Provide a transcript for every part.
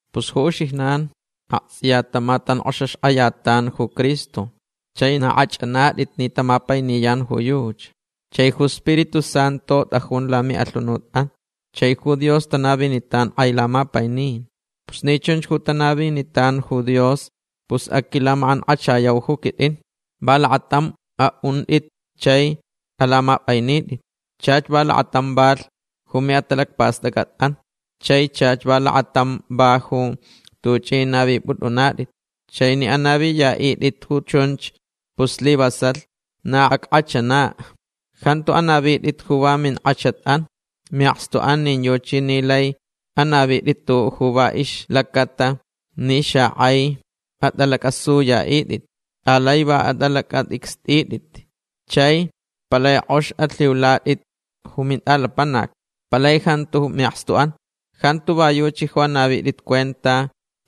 Pus ju uxijnan aktsʼiya tamatankʼoxaxkʼayatan ju Cristo. Chai na kʼachʼanatʼit ni tamapainiyan ju yuchi. Chai ju Spiritu Santu tʼajun lamiʼalhunutʼan. Chai ju Dios tanavinitan kʼai lamapainin. Pus ni chunch ju tanavinitan ju Dios pus aquilamakʼankʼachayau ju quitʼin. Va lakatam aʼuntʼit chai alamapʼainitʼit. Chach va lakatam valh ju miʼatalacpastʼacʼatʼan chai chach va lakatamch valh ju tuchʼi navipʼutʼunatʼit. Chai ni anaviyaʼitʼit ju chunch pus slivasalh na ackʼachanach. Jantu anavitʼit ju va minkʼachatʼan miʼakstuʼan nin yuchi ni laich anavitʼit tuʼuʼ va ixlacaʼatalh ni xakʼai atʼalacʼasuyaʼitʼit. Alai va atʼalacʼatʼicstʼitʼit. Chai palai kʼox alhiulatʼit ju mintʼalapanac. Palai jantu miʼakstuʼan. Jantu va yuchi ju anavitʼit cuenta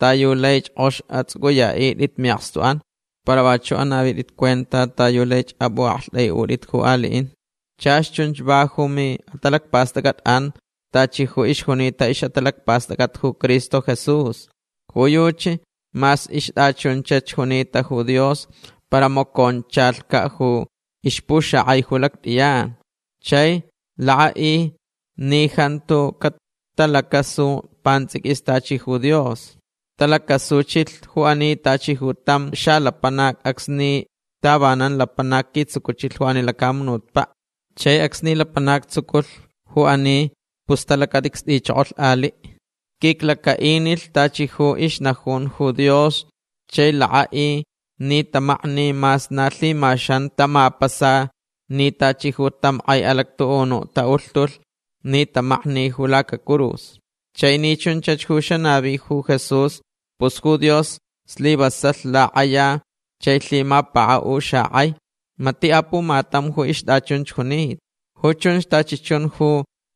ta yu laich kʼox atsʼucʼuyaʼitʼit miʼakstuʼan. Para vachuʼ anavitʼit cuenta ta yu laich apʼuʼaktʼaiʼutʼit ju aliʼin. Chach chunch va ju miʼatalacpastʼacʼatʼan tachi ju ixjunita ixʼatalacpastʼacʼat ju Cristo Jesús. Ju yuchi mas ixtʼachunchach junita ju Dios para maconchalhcaʼ ju ixpuxakʼai ju lactʼiyan. Chai lakʼaʼilh ni jantu catalacasu pantsʼiquis tachi ju Dios. Talacasuchilh ju ani tachi ju tam xalapanac acsni tavanan lapanac quitsucuchilh ju ani lacamunutpaʼ. Chai acsni lapanac tsucuchilh ju ani pus talacatʼicstʼichokolh aliʼ. Quiclacaʼinilh tachi ju ixnajunta ju Dios chai lakʼaʼilh ni tamakni mas na lhimaxan tamapasalh ni tachi ju tam kʼai alactuʼunuʼ taʼulhtulh ni tamaknilh ju lacacurus. Chai ni chunchach ju xanavi ju Jesús pus ju Dios slivasalh lakʼaya chai lhimapakaʼulh xakʼai. Matiʼ apumatam ju ixtʼachunch junita. Ju chunch tachi chun ju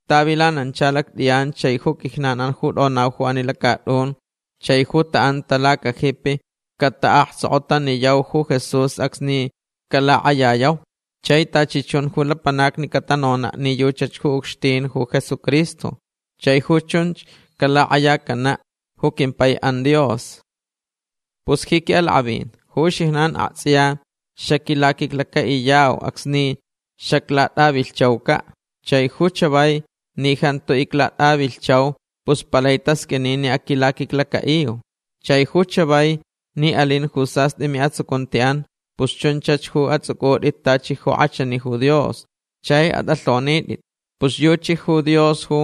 tavilanancha lactʼiyan chai ju quijnanʼan ju tʼonau ju ani lacatʼun chai ju taʼanta lacajipi cataʼaktsokotaniyau ju Jesús acsni calakʼayayauch. Chai tachi chun ju lapanacni catanonaʼ ni yuchach ju ucxtin ju Jesucristo. Chai ju chunch calakʼayacanaʼ ju quimpaiʼan Dios. Pus ji quiʼalakʼavin ju uxijnan aktsʼiya xaquilaquiclacaʼiyauch acsni xaclatʼavilhchaucaʼ. Chai ju chavai ni jantu iclatʼavilhchau pus palai tasqʼuini ni aquilaquiclacaʼiu. Chai ju chavai ni alin ju sastʼi miʼatsucuntiʼan pus chunchach ju atsʼucʼutʼit tachi ju kʼachani ju Dios. Chai atʼalhonitʼit. Pus yuchi ju Dios ju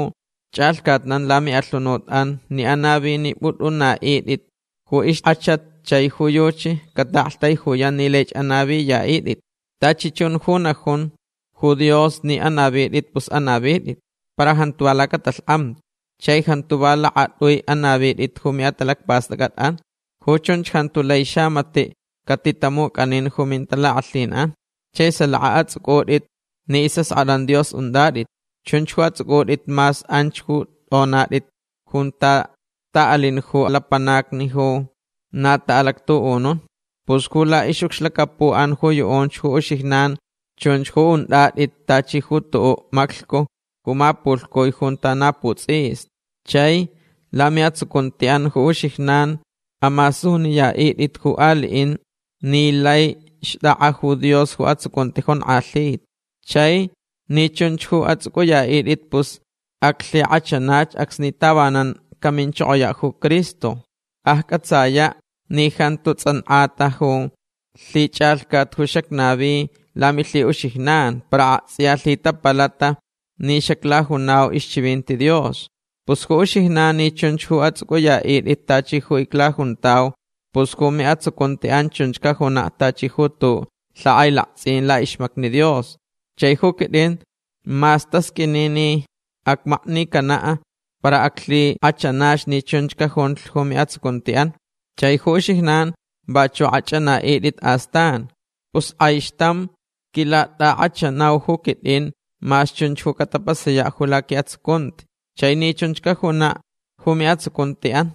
chʼalhcatnan lamiʼalhunutʼan ni anavinipʼutʼunaʼitʼit ju ixkʼachat chai ju yuchi cataʼaktaijuyan ni laich anaviyaʼitʼit. Tachi chun ju najun ju Dios ni anavitʼit pus anavitʼit. Para jantu va lacatalhkʼamti. Chai jantu va lakatʼui anavitʼit ju miʼatalacpastʼacʼatʼan. Ju chunch jantu lai xamatiʼ catitamucʼanin ju mintalakʼalhinʼan. Chai salaka atsʼucʼutʼit ni isʼaskʼatʼan Dios untʼatʼit. Chunch ju atsʼucʼutʼit mas anch ju tʼonatʼit junta taʼalin ju lapanacni ju na taʼalactuʼunun. Pus ju laʼixʼucxlacapuʼan ju yuʼunch ju uxijnan chunch ju untʼatʼit tachi ju tuʼuʼ maclhcu ju mapulhcui junta na putsʼista. Chai lamiʼatsucuntiʼan ju uxijnan amasuniyaʼitʼit ju aliʼin ni lai xtʼakʼa ju Dios ju atsucunti jonkʼalhita. Chai ni chunch ju atsʼucʼuyaʼitʼit pus aclhikʼachanach acsni tavanan caminchokoyaʼ ju Cristo. Accʼatsayaʼ ni jantu tsʼankʼata ju lhichʼalhcat ju xacnavi lamilhiʼuxijnan para aktsʼiya lhitapalata ni xaclajunau ixchivinti Dios. Pus ju uxijnan ni chunch ju atsʼucʼuyaʼitʼit tachi ju iclajuntau pus ju miʼatsucuntiʼan chunch cajunaʼ tachi ju tuʼuʼ lhakʼailaktsʼin laʼixmacni Dios. Chai ju quitʼin mas tasqʼuini ni acmaknicanaʼ para aclhikʼachanach ni chunch cajunlh ju miʼatsucuntiʼan. Chai ju uxijnan vachuʼ akʼachʼanaʼitʼit astan. Pus kʼaixtamch quilatʼakʼachanau ju quitʼin mas chunch ju catapasayaʼ ju laquiʼatsucunti chai ni chunch cajunaʼ ju miʼatsucuntiʼan.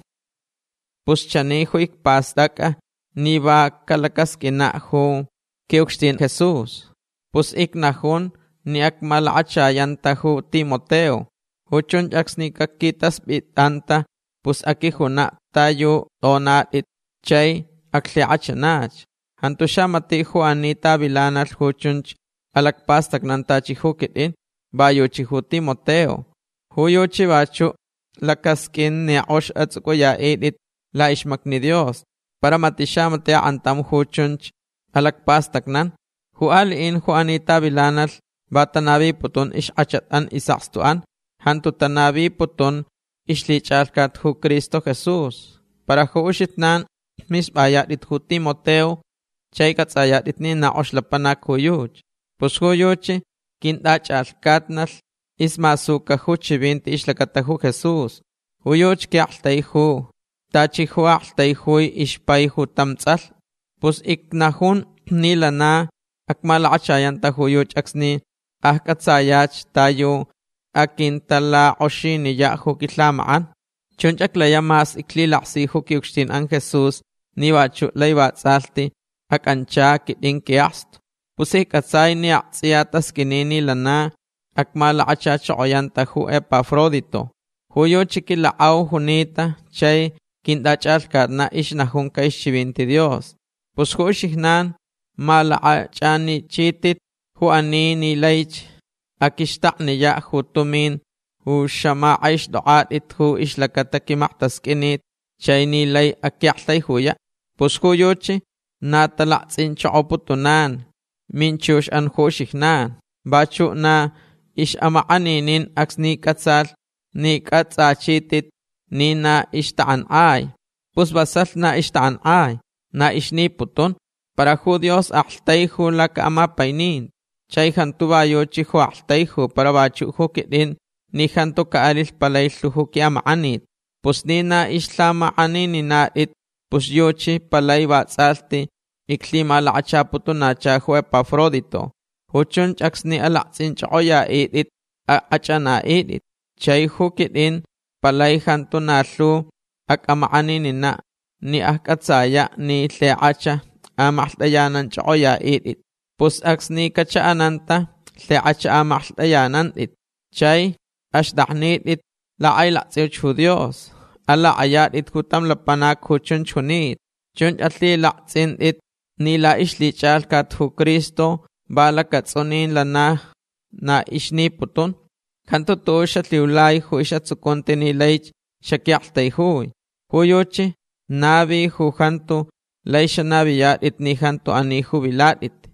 Pus chani ju icpastʼacʼa ni va calacasqʼuinaʼ ju quiʼucxtin Jesús. Pus icnajun ni acmalakachayanta ju Timoteo. Ju chunch acsni caquitaspʼitʼanta pus aquijunaʼ ta yu tʼonatʼit chai aclhikʼachanach. Jantu xamatiʼ ju ani tavilanalh ju chunch alacpastacnan tachi ju quitʼin. Va yuchi ju Timoteo. Ju yuchi vachuʼ lacasqʼuin ni kʼox atsʼucʼuyaʼitʼit laʼixmacni Dios. Para matiʼ xamatiʼ akʼantam ju chunch alacpastacnan. Ju aliʼin ju ani tavilanalh va tanaviputun ixkʼachatʼan isʼakstuʼan. Jantu tanaviputun ixlhichʼalhcat ju Cristo Jesús. Para ju uxijnan mispʼayatʼit ju Timoteo chai cʼatsʼayatʼit ni na kʼox lapanac ju yuchi. Pus ju yuchi quintʼachʼalhcatnalh ismasuca ju chivinti ixlacata ju Jesús. Ju yuchi quiʼaktaiju tachi ju aktaijui ixpai ju tam tsʼalh. Pus icnajun ni lana acmalakachayanta ju yuchi acsni accʼatsayach ta yu aquintalakʼoxiniyaʼ ju quilhamakʼan. Chunch aclayaʼ mas iclhilaksi ju quiʼucxtinʼan Jesús ni vachuʼ lai vatsʼalhti acʼancha quitʼin quiʼakstu. Pus iccʼatsai ni aktsʼiya tasqʼuini ni lana acmalakachachokoyanta ju Epafrodito. Ju yuchi quilakʼau junita chai quintʼachʼalhcatnaʼ ixnajunca ixchivinti Dios. Pus ju uxijnan malakʼachʼanichitʼit ju ani ni laich aquixtakniyaʼ ju tumin ju xamakʼaixtʼokʼatʼit ju ixlacata quimaktasqʼuinit chai ni lai aquiʼaktaijuyaʼ. Pus ju yuchi na talaktsʼinchokoputunan minchuxʼan ju uxijnan. Vachuʼ na ixʼamakʼaninin acsni cʼatsalh ni cʼatsʼachitʼit ni na ixtakʼankʼai. Pus vasalh na ixtakʼankʼai. Na ixniputun. Para ju Dios aktaijulh lacaʼamapaininti. Chai jantu va yuchi ju aktaiju para vachuʼ ju quitʼin ni jantu caʼalilh palai lhu ju quiʼamakʼanit. Pus ni na ixlhamakʼanininatʼit pus yuchi palai vatsʼalhti iclhimalakachaputunacha ju Epafrodito. Ju chunch acsni alaktsʼinchʼokʼoyaʼitʼit akʼachʼanaʼitʼit. Chai ju quitʼin palai jantu na lhu acʼamakʼanininaʼ ni accʼatsayaʼ ni lhikʼach amaklhtʼayananchʼokʼoyaʼitʼit. Pus acsni cachaʼananta lhikʼach amaklhtʼaʼitʼit chai axtʼaknitʼit lakʼailaktsʼiuch ju Dios. Alakʼayatʼit ju tam lapanac ju chunch junita. Chunch alhilaktsʼintʼit ni laʼixlhichʼalhcat ju Cristo va lacatsʼunin lana na ixniputun. Jantu tuʼuʼ xalhiulai ju isʼatsucunti ni laich xaquiʼaktaijui. Ju yuchi navilh ju jantu lai xanaviyatʼit ni jantu ani ju vilatʼit.